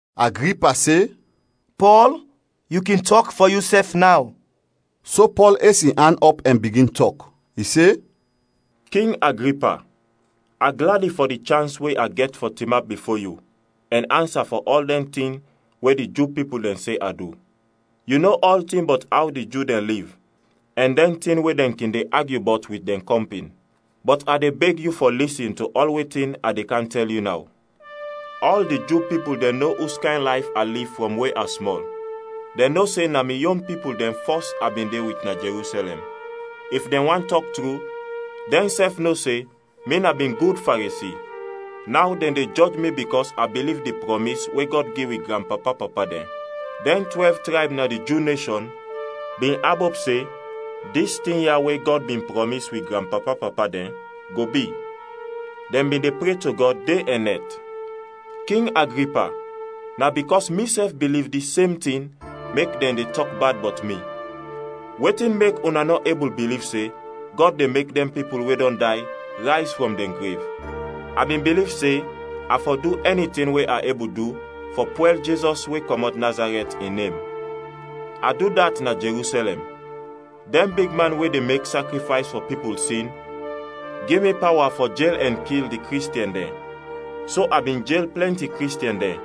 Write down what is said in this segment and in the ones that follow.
Agripa se, “Pɔl, yu kin tɔk fɔ yusɛf naw.” So Pɔl es in an ɔp ɛn bigin tɔk; i se, “King Agripa, a gladi fɔ di chans we a gɛt fɔ tinap bifo yu ɛn ansa fɔ ɔl dɛn tin we di Ju pipul dɛn se a du. Yu no ɔltin bɔt aw di Ju dɛn liv ɛn dɛn tin we dɛn kin de agyu bɔt wit dɛn kɔmpin, bɔt a de beg yu fɔ lisin to ɔl wetin a de kam tɛl yu naw. “Ɔl di Ju pipul dɛn no uskayn layf a liv frɔm we a smɔl, dɛn no se na mi yon pipul dɛn fɔs a bin de wit na Jerusɛlɛm. If dɛn want tɔk tru, dɛnsɛf no se mi na bin gud Faresi. Naw dɛn de jɔj mi bikɔs a biliv di prɔmis we Gɔd gi wi granpapa-papa dɛn. Dɛn twɛlv trayb na di Ju neshɔn bin abop se dis tin ya we Gɔd bin prɔmis wi granpapa-papa dɛn, go bi. Dɛn bin de pre to Gɔd de ɛn nɛt. King Agripa, na bikɔs misɛf biliv dis sem tin mek dɛn de tɔk bad bɔt mi. Wetin mek una nɔ ebul biliv se Gɔd de mek dɛn pipul we dɔn day rayz frɔm dɛn grev? “A bin biliv se a fɔ du ɛni tin we a ebul du fɔ pwɛl Jizɔs we kɔmɔt Nazarɛt, in nem. A du dat na Jerusɛlɛm. Dɛn bigman we de mek sakrifays fɔ pipul sin gi mi pawa fɔ jel ɛn kil di Kristiɛn dɛn so a bin jel plɛnti Kristiɛn dɛn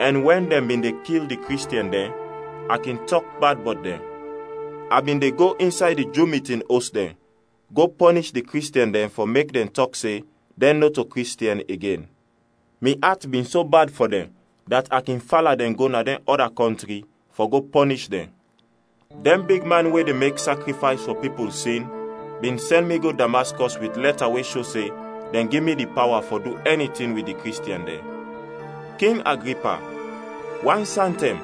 ɛn wɛn dɛn bin de kil di Kristiɛn dɛn, a kin tɔk bad bɔt dɛn. A bin de go insay di Ju mitin os dɛn go pɔnish di Kristiɛn dɛn fɔ mek dɛn tɔk se dɛn nɔto Kristiɛn igen. Mi at bin so bad fɔ dɛn dat a kin fala dɛn go na dɛn ɔda kɔntri fɔ go pɔnish dɛn. “Dɛn bigman we de mek sakrifays fɔ pipul sin bin sɛn mi go Damaskɔs wit lɛta we sho se dɛn gi mi di pawa fɔ du ɛni tin wit di Kristiɛn dɛn. King Agripa, wan santɛm,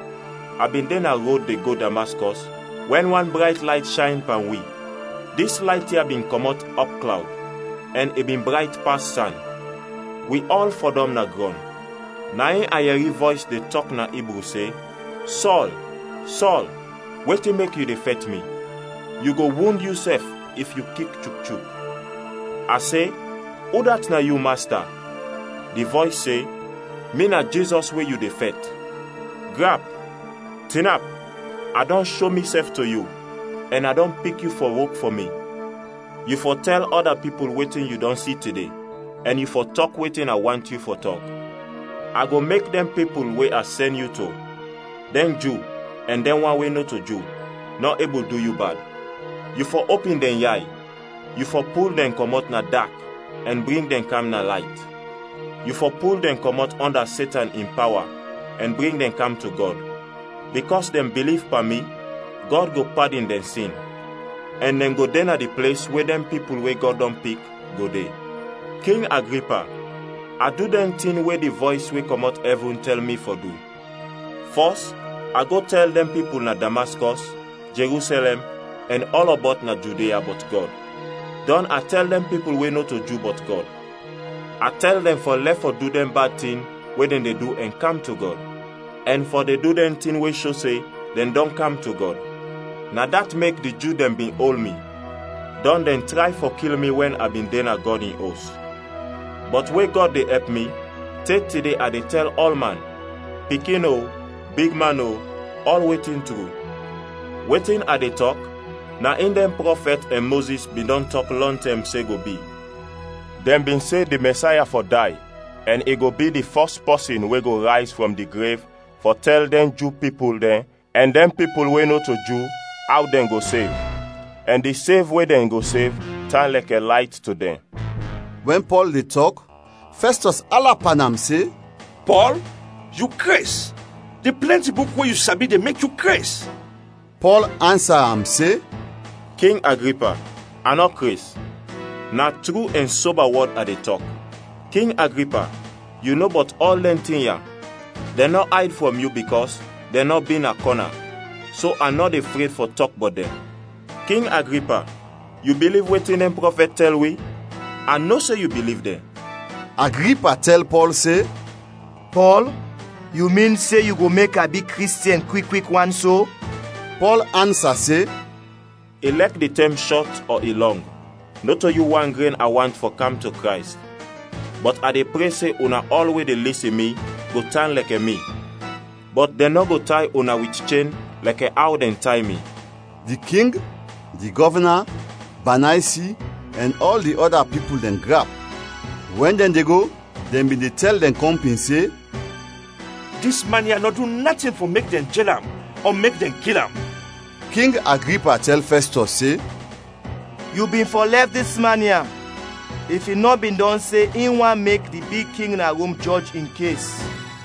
a bin de na rod de go Damaskɔs wɛn wan brayt layt shayn pan wi. Dis layt ya bin kɔmɔt ɔpklawd ɛn i bin brayt pas san. Wi ɔl fɔdɔm na grɔn, na in a yɛri vɔys de tɔk na Ibru se, ‘Sɔl, Sɔl, wetin mek yu de fɛt mi? Yu go wund yusɛf if yu kik chuk-chuk.’ A se, ‘Udat na yu, Masta?’ Di vɔys se, ‘Mi na Jizɔs we yu de fɛt! Grap, tinap; A dɔn sho misɛf to yu ɛn a dɔn pik yu fɔ wok fɔ mi. Yu fɔ tɛl ɔda pipul wetin yu dɔn si tide ɛn yu fɔ tɔk wetin a want yu fɔ tɔk. A go mek dɛn pipul we a sɛn yu to, dɛn Ju ɛn dɛn wan we nɔto Ju, nɔ ebul du yu bad. Yu fɔ opin dɛn yay; yu fɔ pul dɛn kɔmɔt na dak ɛn bring dɛn kam na layt. Yu fɔ pul dɛn kɔmɔt ɔnda Setan in pawa ɛn bring dɛn kam to Gɔd. Bikɔs dɛn biliv pan mi, Gɔd go padin dɛn sin, ɛn dɛn go de na di ples we dɛn pipul we Gɔd dɔn pik, go de.’ “King Agripa, a du dɛn tin we di vɔys we kɔmɔt ɛvin tɛl mi fɔ du. Fɔs a go tɛl dɛn pipul na Damaskɔs, Jerusɛlɛm, ɛn ɔlɔbɔt na Judia, bɔt Gɔd; dɔn a tɛl dɛn pipul we nɔto Ju bɔt Gɔd. A tɛl dɛn fɔ lɛf fɔ du dɛn bad tin we dɛn de du ɛn kam to Gɔd, ɛn fɔ de du dɛn tin we sho se dɛn dɔn kam to Gɔd. Na dat mek di Ju dɛn bin ol mi, dɔn dɛn tray fɔ kil mi wɛn a bin de na Gɔd in Os. Bɔt we Gɔd de ɛp mi, te tide a de tɛl ɔlman, pikin o, bigman o, ɔl wetin tru. Wetin a de tɔk, na in dɛn prɔfɛt ɛn Mozis bin dɔn tɔk lɔntɛm se go bi. Dɛn bin se di Mɛsaya fɔ day ɛn i go bi di fɔs pɔsin we go rayz frɔm di grev fɔ tɛl dɛn Ju pipul dɛn ɛn dɛn pipul we nɔto Ju aw dɛn go sev, ɛn di sev we dɛn go sev tan lɛkɛ layt to dɛn.” Wɛn Pɔl de tɔk, Fɛstɔs ala pan am se, “Pɔl, yu kres! Di plɛnti buk we yu sabi de mek yu kres!” Pɔl ansa am se, “King Agripa, a nɔ kres! Na tru ɛn soba wɔd a de tɔk. King Agripa, yu no bɔt ɔl dɛn tin ya, dɛn nɔ ayd frɔm yu bikɔs dɛn nɔ bi na kɔna, so a nɔ de fred fɔ tɔk bɔt dɛn. King Agripa, yu biliv wetin dɛn prɔfɛt tɛl wi? A no se yu biliv dɛn!” Agripa tɛl Pɔl se, “Pɔl, yu min se yu go mek a bi Kristiɛn kwik kwik wan so?” Pɔl ansa se, “Ilɛk di tɛm shɔt ɔ i lɔng, nɔto yu wan gren a want fɔ kam to Krays, bɔt a de pre se una ɔl we de lisin mi go tan lɛkɛ mi bɔt dɛn nɔ go tay una wit chen lɛkɛ aw dɛn tay mi.” Di king, di gɔvna, Banaysi ɛn ɔl di ɔda pipul dɛn grap. Wɛn dɛn de go, dɛn bin de tɛl dɛn kɔmpin se, “Dis man ya nɔ du natin fɔ mek dɛn jel am ɔ mek dɛn kil am.” King Agripa tɛl Fɛstɔs se, “Yu bin fɔ lɛf dis man ya if i nɔ bin dɔn se in want mek di big king na Rom jɔj in kes.”